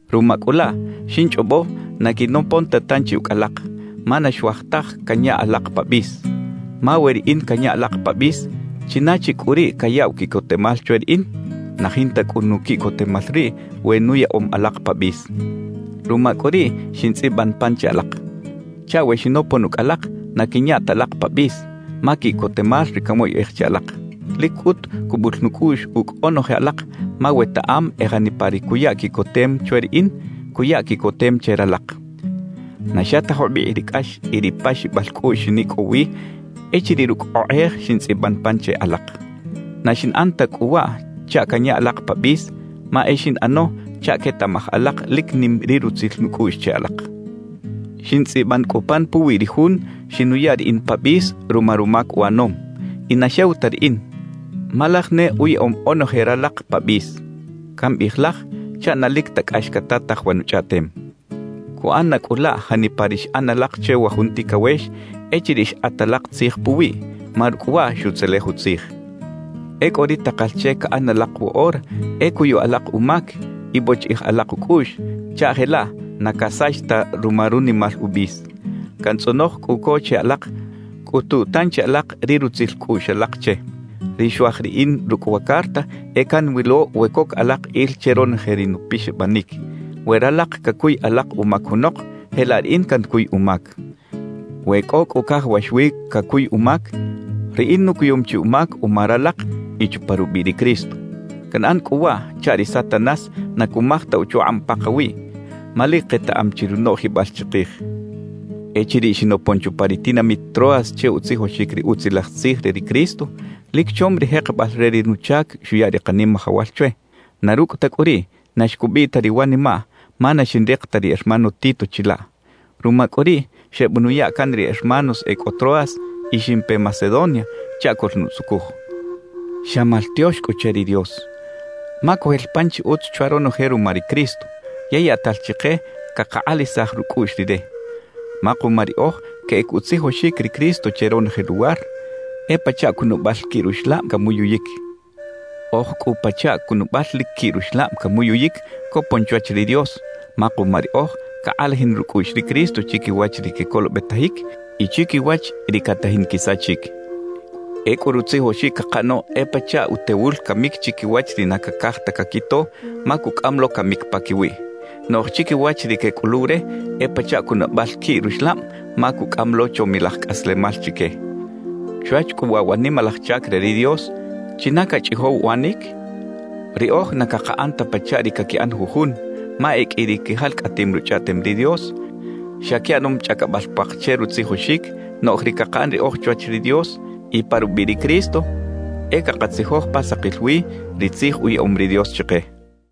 Ruma cꞌu laꞌ, xinchꞌobo na quinopon ta tanchi ucꞌ alak, ma na xuaj taj canya alak pa bis. Ma we riꞌin canya alak pa bis, ¿china chi cꞌu riꞌ cayaꞌw quiꞌcotemal chwe riꞌin? Na jinta cꞌu nuquiꞌcotemal riꞌ we nuyaꞌom alak pa bis. Ruma cꞌu riꞌ xintzꞌiban pan che alak, chaꞌ we xinopon ucꞌ alak, na quinya ta alak pa bis, ma quiꞌcotemal ri canwoyꞌej che alak. Lic cꞌut cubul nucꞌuꞌx ucꞌ onoje alak, ma wetaꞌam e janipa ri cuya quiꞌcotem chwe riꞌin, cuya quiꞌcotem che ralak. Na xa ta jubikꞌ ri cꞌax y ri paxibal cꞌuꞌx xinicꞌow wi echiriꞌ rucꞌ okꞌej xintzꞌiban pan che alak. Na xinꞌan ta cꞌu waꞌ chaꞌ canya alak pa bis, ma e xinꞌano chaꞌ quetaꞌmaj alak lic nim ri rutzil nucꞌuꞌx che alak. Xintzꞌiban cꞌu pan puwi ri jun xinuya riꞌin pa bis ruma rumac uꞌanom. Y na xew ta riꞌin, ma laj ne uyaꞌom onoje ralak pa bis. (Cambiꞌij “Laj” chaꞌ na lic ta cꞌax catataj wa nuchꞌaꞌtem.) Cuꞌan na cꞌu laꞌ janipa ri xꞌan alak che wa jun ticawex echiriꞌ xkꞌat alak tzij puwiꞌ, ma rucꞌ waꞌ xutzelej utzij. Ecꞌu ri takal che caꞌan alak woꞌora e cuyu alak umac y bochiꞌij alak ucꞌuꞌx chaꞌ jelaꞌ na casach ta ruma runimal ubis. Cantzꞌonoj cꞌu co che alak cꞌutu tanchi alak ri rutzil cꞌuꞌx alak che. Ri xuaj riꞌin rucꞌ wa carta e canwilo we coc alak il che ronoje ri nupixabanic. We ralak cacuy alak umac junok, jelaꞌ riꞌin cancuy umac. We cꞌo cꞌu cajawax wi cacuy umac, riꞌin nucuyum chi umac uma ralak y chupa rubiꞌ ri Cristo. Canꞌan cꞌu waꞌ chaꞌ ri Satanás na cumaj ta uchukꞌab pakawiꞌ, ma lic ketaꞌam chi runoꞌjibal chikij. Echiriꞌ xinopon chupa ri tinamit Troas che utzijoxic ri Utzilaj Tzij re ri Cristo, lic chom ri jekebal re ri nuchac xuya ri Kanimajawal chwe; na rucꞌ ta cꞌu riꞌ, na xcubiꞌ ta ri wanimaꞌ, ma na xinrik ta ri hermano Tito chilaꞌ. Ruma cꞌu riꞌ, xebenuya can ri hermanos e cꞌo Troas y ximpe Macedonia chaꞌ coꞌlnutzucuj. ¡Xa maltiox cꞌu che ri Dios! Ma cojel pan chi utz chwa ronoje ruma ri Cristo, yey yaꞌtal chike cakakꞌalajisaj rucꞌuꞌx Rire. Ma kuma riꞌoj queꞌec utzijoxic ri Cristo che ronoje luwar, e pachaꞌ cunabal quiꞌ ruxlab camuyuyic. Oj cꞌu pachaꞌ cunabal lic quiꞌ ruxlab camuyuyic copon chwach ri Dios, ma kuma riꞌoj cakꞌalajin rucꞌuꞌx ri Cristo chiquiwach ri quecolobetajic y chiquiwach ri catajin quisachic. Ecꞌu rutzijoxic cakaꞌano e pachaꞌ utewul camic chiquiwach ri na cacaj ta caquito, ma cucꞌam lo camic paquiwiꞌ. Noꞌj chiquiwach ri quecꞌuluw re, e pachaꞌ cunabal quiꞌ ruxlab, ma cucꞌam lo chomilaj cꞌaslemal chique. Chwach cꞌu waꞌ wa nimalaj chac re ri Dios, ¿china cachꞌijow uꞌanic? Riꞌoj na cakaꞌan ta pachaꞌ ri caquiꞌan jujun, ma e qꞌui ri quijalcꞌatim Ruchꞌaꞌtem ri Dios, xa quiꞌanom chꞌacabal puak che rutzijoxic; noꞌj ri cakaꞌan riꞌoj chwach ri Dios y pa rubiꞌ ri Cristo, e cakatzijoj pa sakil wi ri Tzij uyaꞌom ri Dios chike.